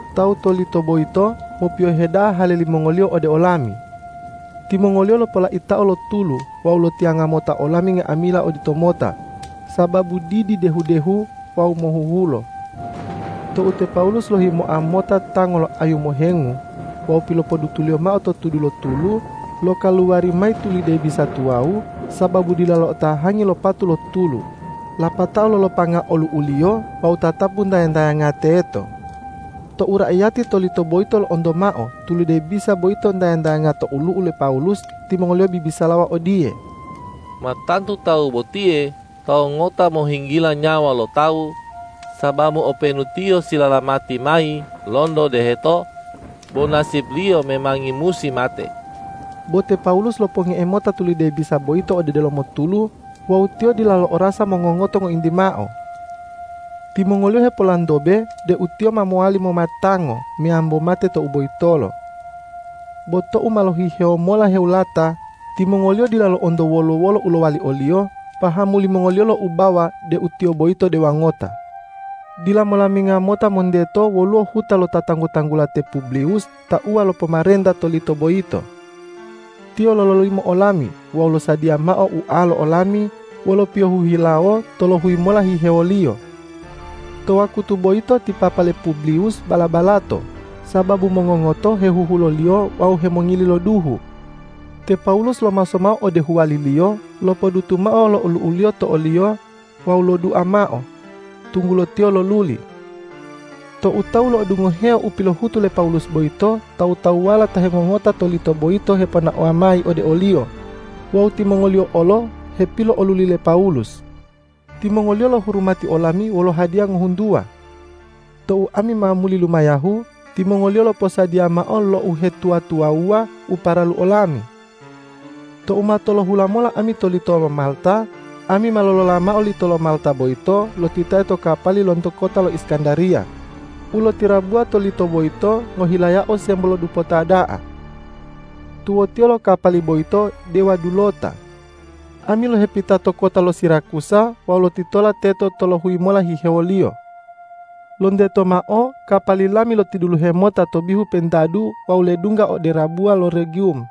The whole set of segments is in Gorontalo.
Tawu to lito boyito mopiyohe da'a hale limongoliyo ode olami. Timongoliyo lopolaitao lo tulu wawu lotiyanga mota olami nga'amila oditomota sababu didi dehu-dehu wawu mohuhulo. Tou te Pawulus lohimoa mota tango lo ayu mohengu wawu pilopodutuliyo mao to tudu lo tulu, lokaluwari mayi tulide bisa tuwawu sababu dila lo'otahangi lo patu lo tulu, lapatao lolopanga olu'uliyo wawu tatapu ntaya-ntayanga teto. Tou raiyati to lito boyito lo'onto mao tulide bisa boyito ntaya-ntayanga to olu'u le Pawulus, timongoliyo bibisalawa odiye,”Ma tantu tawu botiye tawu ngota mohinggila nyawa lo tawu, sababu openu tiyo silalamati mayi lonto deheto, bo nasipliyo memangi musi mate.” Bo te Pawulus loponge'e mota lo tulide bisa boyito ode delomo tulu wawu tiyo dila lo'orasa mongongoto ngointi mao. Timongoliyo hepolantobe deu tiyo ma mowali mommatango meyambo mate tou boyitolo. Bo tou ma lohihewo mola hewulata, timongoliyo dila lo'onto wolo-wolo u lowali oliyo, pahamu limongoliyo loubawa deu tiyo boyito dewa ngota. Dila molaminga mota monteto woluwo huta lo ta tanggu-tanggula te Publiwus tauwa lo pomarenta to lito boyito. Tiyo lololimo olami wawu losadiya mao ualo olami wolo piyohu hilawo tolohuyi mola hihewoliyo. To wakutu boyito ti papa le Publiwus bala-balato, sababu mongongoto hehuhuloliyo wawu hemongili lo duhu. Te Pawulus lomaso mao ode huwaliliyo, lopodutu mao lo olu'uliyo to oliyo wawu lodua mao, tunggulo tiyo loluli. Tou tawu lo'odungoheo u pilohutu le Pawulus boyito, tawu-tawuwala ta hengongota to lito boyito heponaowa mayi ode oliyo wawu timongoliyo olo hepilo'oluli le Pawulus. Timongoliyo lohurumati olami wolo hadiya ngohuntuwa. Tou ami ma muli lumayahu, timongoliyo loposadiya mao lo uhetuwa-tuwawuwa u paralu olami. Tou ma tolohula mola ami to lito lo Malta, ami ma lolola mao lito lo Malta boyito lotitae to kapali lonto kota lo Iskandariya u lotirabuwa to lito boyito ngohilayao sembo lo dupota da'a. Tuwotiyo lo kapali boyito dewa dulota. Ami lohepita to kota lo Sirakusa wawu lotitola teto tolohuyi mola hihewoliyo. Lonteto mao kapali lami lotiduluhe mota to bihu pentadu wawu ledungga ode rabuwa lo Regiwum.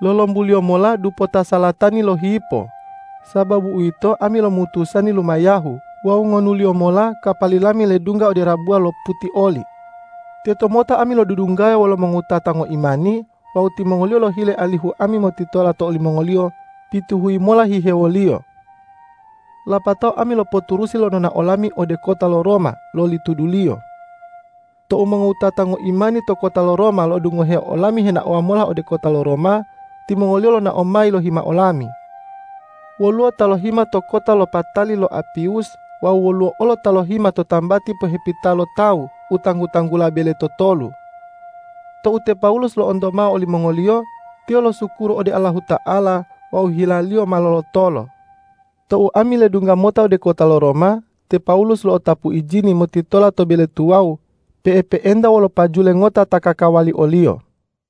Lolombuliyo mola dupoto salatani lohipo. Sababu uwito, ami lomutusani lumayahu wawu ngonuliyo mola kapali lami ledungga ode rabuwa lo Putioli. Tetomota ami lodudunggaya wolo mongowutata ngoimani wawu timongoliyo lohile alihu ami motitola to olimongoliyo pituhuyi mola hihewoliyo. Lapatao ami lopoturusi lo nonao lami ode kota lo Roma loli tuduliyo. Tou mongowutata ngoimani to kota lo Roma lo'odungoheo olami henaowa mola ode kota lo Roma, timongoliyo lonao mayi lohima olami. Woluwo ta lohima to kota lo Patali lo Apiwus wawu woluwo olo ta lohima to tambati pohepita lo tawu u tanggu-tanggula Bele Totolu. Tou te Pawulus lo'onto mao olimongoliyo, tiyo losukuru ode Allahuta'ala wawu hilaliyo ma lolotolo. Tou ami ledungga mota ode kota lo Roma, te Pawulus lo'otapu ijini motitola to bele tuwawu pe'epe'enta wolo pajule ngota ta kakawali oliyo.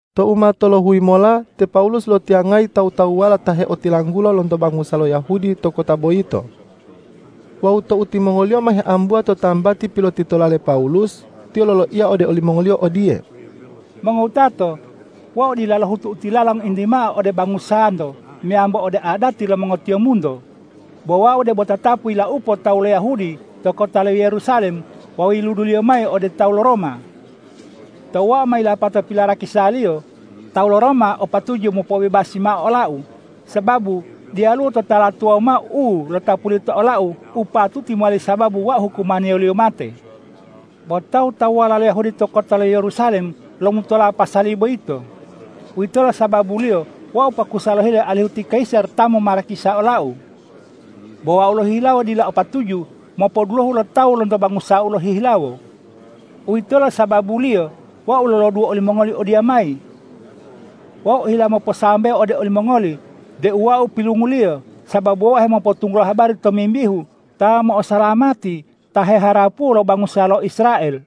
Tou ma tolohuyi mola te Pawulus lotiyangayi tawu-tawuwala ta heotilanggula lonto bangusa lo Yahudi to kota boyito. Wawu tou timongoliyo ma heambuwa to tambati pilotitola le Pawulus, tiyo loloiya ode olimongoliyo odiye,”Mongowutato, wau dila lohutu u tilala ngointi mao ode bangusanto meyambo ode adati lo mongotiyombunto, bo wau debo tatapu yilaupo tawu lo Yahudi to kota lo Yerusalem wawu yiluduliyo mayi ode tawu lo Roma. Tou wau ma yilapato pilarakisaliyo, tawu lo Roma o patuju mopobebasi mao olau, sababu diyalu totala tuwawu mao u lotapuliyo to olau u patuti mowali sababu wau hukumaniyoliyo mate. Bo tawu-tawuwala lo Yahudi to kota lo Yerusalem lomutola pasali boyito. Uwitolo sababuliyo wau pakusa lohile alihu ti kayisar ta momarakisa olau. Bo wau lohihilawo dila o patuju mopodulohu lo tawu lonto bangusau lohihilawo. Uwitolo sababuliyo wau loloduwo olimongoli odiyamayi. Wau ohila moposambewo ode olimongoli deu wau pilunguliyo, sababu wau hemopotunggulo habari tomimbihu Ta mo'osalamati ta heharapuwo lo bangusa lo Israel.”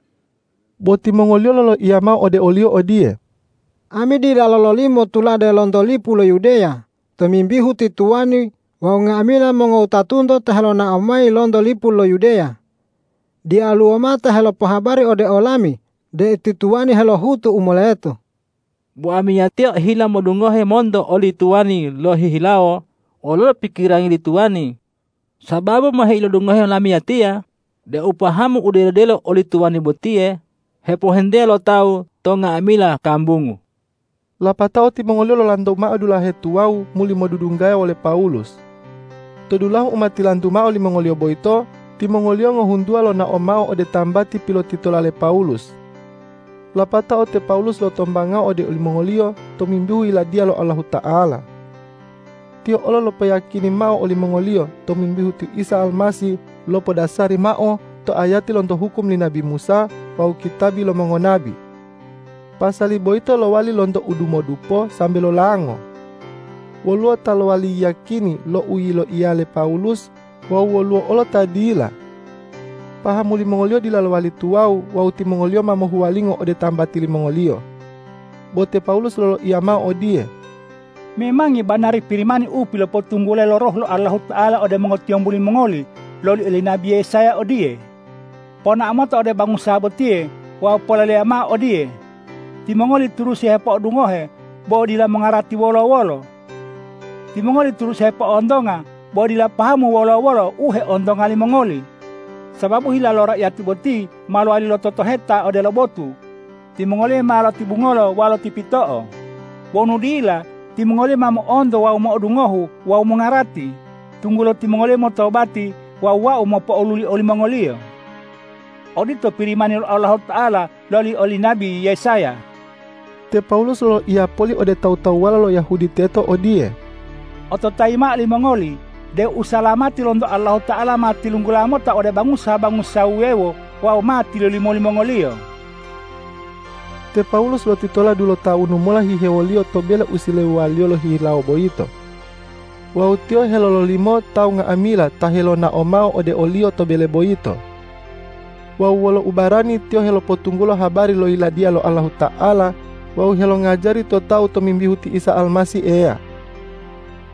Bo timongoliyo loloiya mao ode oliyo odiye,”Ami dila lololimo tulade lonto lipu lo Yudeya tomimbihu ti tuwani wawu nga'amila mongowutatunto ta helonao mayi lonto lipu lo Yudeya, diyaluwo mao ta helopohabari ode olami deu ti tuwani helohutu u moleto. Bo amiyatiya ohila modungohe monto oli tuwani lohihilawo wololo pikirangi li tuwani, sababu ma heilodungohe lamiyatiya deu pahamu u delo-delo oli tuwani botiye hepohentea lo tawu to nga'amila kambungu.” Lapatao timongoliyo lolantu mao dulahe tuwawu muli modudunggaya wole Pawulus. To dulahu u ma tilantu mao limongoliyo boyito, timongoliyo ngohuntuwa lonao mao ode tambati pilotitola le Pawulus. Lapatao te Pawulus lotombangao ode olimongoliyo tomimbihu Yiladiya lo Allahuta'ala. Tiyo olo lopoyiyakini mao olimongoliyo tomimbihu ti Isa Almasih lopodasari mao to ayati lonto hukum li nabi Musa wawu kitabi lo mongonabi. Pasali boyito lowali lonto udumodupo sambe lolango. Woluwo ta lowali yiyakini lo u yiloiya le Pawulus wawu woluwo olo ta dila. Pahamu limongoliyo dila lowali tuwawu wawu timongoliyo ma mohuwalingo ode tambati limongoliyo. Bo te Pawulus loloiya mao odiye,”Memangi banari Pirimani u pilopotunggulayi lo Roh lo Allahuta'ala ode mongotiyombu limongoli loli oli nabi Yesaya odiye, ’Ponao mota ode bangusa botiye wawu poleleya mao odiye: Timongoli turusi hepo'odungohe, bo dila mongarati wolo-wolo. Timongoli turusi hepo'ontonga, bo dila pahamu wolo-wolo u heontonga limongoli. Sababu hila lo raiyati boti ma lowali lototoheta odelo botu; timongoliyo ma lotibungolo wawu lotipito'o. Wonu dila, timongoliyo ma mo'onto wawu mo'odungohu wawu mongarati, tunggulo timongoliyo motobati wawu Wau mopo'oluli olimongoliyo.’ Odito Pirimani lo Allahuta'ala loli oli nabi Yesaya.” Te Pawulus loloiya poli ode tawu-tawuwala lo Yahudi teto odiye,”Ototayi mao limongoli deu usalamati lonto Allahuta'ala ma tilunggula mota ode bangusa-bangusa wuwewo wawu ma tilolimo limongoliyo.” Te Pawulus lotitola dulotawunu mola hihewoliyo to bele u silewuwaliyo lohihilawo boyito. Wawu tiyo helololimo tawu nga'amila ta helonao mao ode oliyo to bele boyito. Wawu wolo ubarani tiyo helopotunggulo habari lo Yiladiya lo Allahuta'ala wawu helongajari to tawu tomimbihu ti Isa Almasih Eya.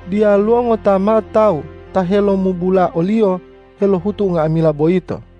Diyaluwo ngota mao tawu ta helomubula oliyo helohutu unga'amila boyito.